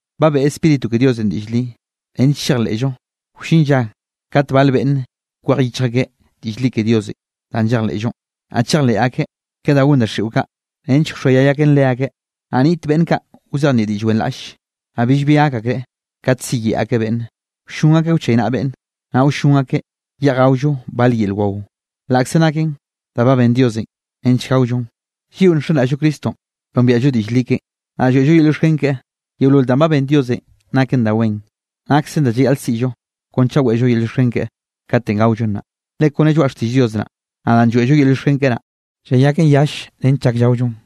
Ba beꞌe Spíritu ke Diosenꞌ diꞌll li, nench chejleꞌllo wllin lla kate bale beꞌnne kwej yichj akeꞌ diꞌll li ke Diosenꞌ danꞌ llejleꞌllonꞌ, naꞌ chejleꞌ akeꞌ ke da gon daxiꞌo kaꞌ nench wxoayay aken leakeꞌ. Naꞌ nniꞌt beꞌnn kaꞌ wzejnieꞌ diꞌll wenraꞌlle, naꞌ billbi gak akreꞌ kat siyeꞌe akeꞌ beꞌnne. Wllon akeꞌ wchaynaꞌa beꞌnne, naꞌ wllon akeꞌ yeꞌj gaollo bal yel wao, laꞌkze naken da ba ben Diosenꞌ nench gaollon, lliꞌo nxenraꞌll-llo Cristonꞌ nombiaꞌllo diꞌll li keꞌen, naꞌ lloeꞌllo yel llioxken keꞌe. Yeolol danꞌ ben Diosenꞌ naken da wen, naksen da llayaꞌl siꞌllo kon chaꞌ weꞌllo yel llioxken keꞌe, katenꞌ gaollon naꞌ. Le kone lloaꞌ xtiꞌll Dios naꞌ, naꞌ danꞌ lloeꞌllo yel llioxken naꞌ, llayaken yall nench llak llaollon.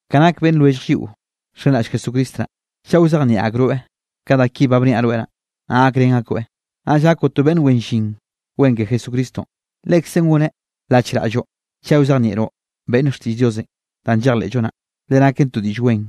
Ka nak beꞌnn lwellj lliꞌo nxenraꞌll Jesucristo naꞌ, chaꞌ wzejnieꞌ akroeꞌ ka da ki ba bniaꞌ rweꞌ naꞌ, naꞌ gakrén akoeꞌ, naꞌll gakoꞌ to beꞌnn wen llin wen ke Jesucristonꞌ. Lekzen gonen lachraꞌlloꞌ chaꞌ wzejnieꞌroꞌ beꞌnn xtiꞌll Diosenꞌ danꞌ llejleꞌllo naꞌ, le naken to diꞌll wen,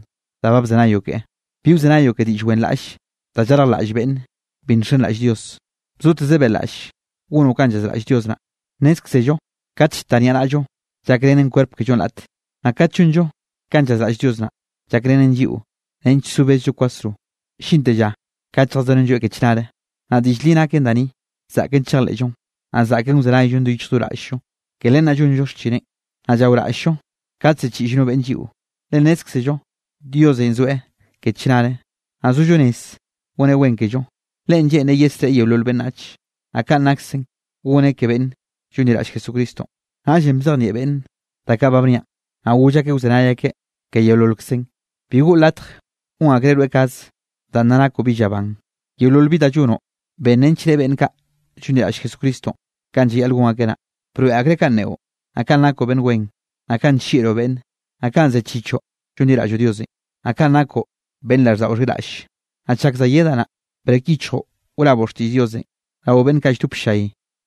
da ba bzenayoꞌ ke. Bi wzenayoꞌ ke diꞌll wenraꞌlle da llarjlaꞌll beꞌnn bi nxenraꞌll Dios. Bzoteze beꞌlaꞌll gonoꞌ kanꞌ llazraꞌll Dios naꞌ. Nnézkzello kat llta niaꞌnaꞌllo, llakrenen kwerp kellonꞌ raꞌte. Naꞌ kat llonllo kanꞌ llazraꞌll Dios naꞌ, llakrenllen lliꞌo nench zo bezllo kwasro, llinte lla kat lljazorenlloeꞌ ke chnare. Naꞌ diꞌll li naken da ni, zaꞌken chejleꞌllon, naꞌ zaꞌken wzenayllon do yichj do raꞌll-llo. Ke len naꞌ llonllo xchineꞌn, naꞌ llaoraꞌll-llo kat ziꞌchiꞌll no beꞌnn lliꞌo, le nnézkzello Diosenꞌ zoeꞌ ke chnare, naꞌ sollo rez goneꞌ wen kello, Leꞌen lleꞌnreꞌ yesreꞌe yeolol beꞌnnach, naꞌ kaꞌn naksen goneꞌ ke beꞌnn llonliraꞌll Jesucristonꞌ. Naꞌllenꞌ bzejnieꞌ beꞌnne da kaꞌ ba bniaꞌn, naꞌ goll akeꞌ wzenay akeꞌ ke yeololkzen. Bi goꞌo latj gon akreꞌ rweꞌ kaze danꞌ nna nakoꞌ bi llaban. Yeolol bi da llonoꞌ, ben nench reꞌe beꞌnn kaꞌ llonliraꞌll Jesucristonꞌ kanꞌ llayaꞌl gon akeꞌ naꞌ. Broeꞌ akreꞌ kanꞌ neꞌo, naꞌ kanꞌ nakoꞌ beꞌnn wen, naꞌ kanꞌ nllieꞌroꞌ beꞌnne, naꞌ kanꞌ zechichoꞌ llonliraꞌlloꞌ Diosenꞌ, naꞌ kanꞌ nakoꞌ beꞌnn raꞌlldaꞌo xhiraꞌlle. Naꞌ chak za yedaꞌ naꞌ, brek yichjoꞌ wraboꞌ xtiꞌll Diosenꞌ, rao beꞌnn kaꞌ lldop ll-llay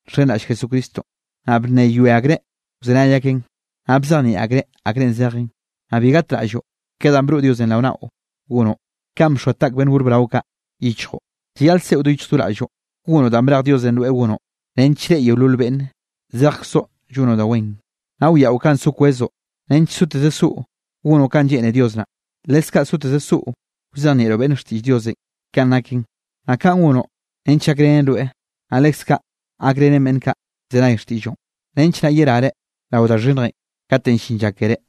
nxenraꞌll Jesucristonꞌ, naꞌ bnneyoe akreꞌ wzenay akeꞌn, naꞌ bzejnieꞌ akreꞌ akrenꞌ zejenꞌ. Naꞌ bi gatraꞌlloꞌ ke danꞌ broꞌ Diosenꞌ rao naꞌo gonoꞌ, kanꞌ bxoa taꞌk beꞌnn gor brao kaꞌ yichjoꞌ. Llayaꞌl seꞌo do yichj do raꞌlloꞌ, gonoꞌ danꞌ brej Diosenꞌ rweꞌ gonoꞌ, nench reꞌe yeolol beꞌnne zejkzoꞌ llonoꞌ da wen. Naꞌ wiaꞌo kanꞌ so kwezoꞌ nench soteze soꞌo gonoꞌ kanꞌ lleꞌne Dios naꞌ, leskaꞌ soteze soꞌo wzejnieꞌroꞌ beꞌnne xtiꞌll Diosenꞌ kanꞌ naken. Naꞌ kaꞌn gonoꞌ nench gakrenen rweꞌ, naꞌ leskaꞌ gakrenen beꞌnn kaꞌ llzenay xtiꞌlloꞌn, nench naꞌ yerare rao da xhinnjenꞌ kate llin lla keré.